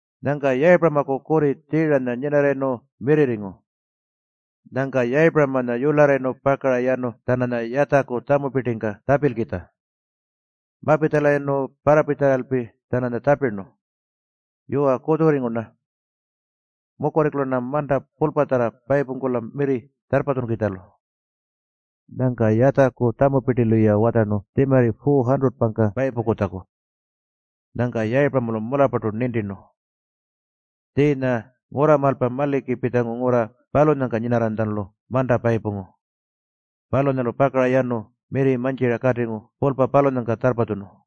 Nyangka Yayipuramaku kurri Tjiiranya nyinarrayirnu mirrirringu. Nyangka Yayipuramanya yularrayirnu pakara yanu-tjananya Yatjaku tjamupirtingka tjapilkitja. Mapitjalayirnu parrapitjalalpi-tjananya tjapirnu, “Yuwa, kutjurringu-rna. Mukurringkula-rna manta pulpatjarra payipungkula mirri tjarrpatjunkukitjalu.” Nyangka Yatjaku tjamupirtilu-ya watjarnu tjimarri 400-pangka payipungkutjaku. Nyangka Yayipuramalu mularrpartu nintirnu. Tjiinya ngurramaalpa maliki pitjangu ngurra palunyangka nyinarranytjalu manta payipungu. Palunyalu pakara yanu mirri mantjira katingu pulpa palunyangka tjarrpatjunu.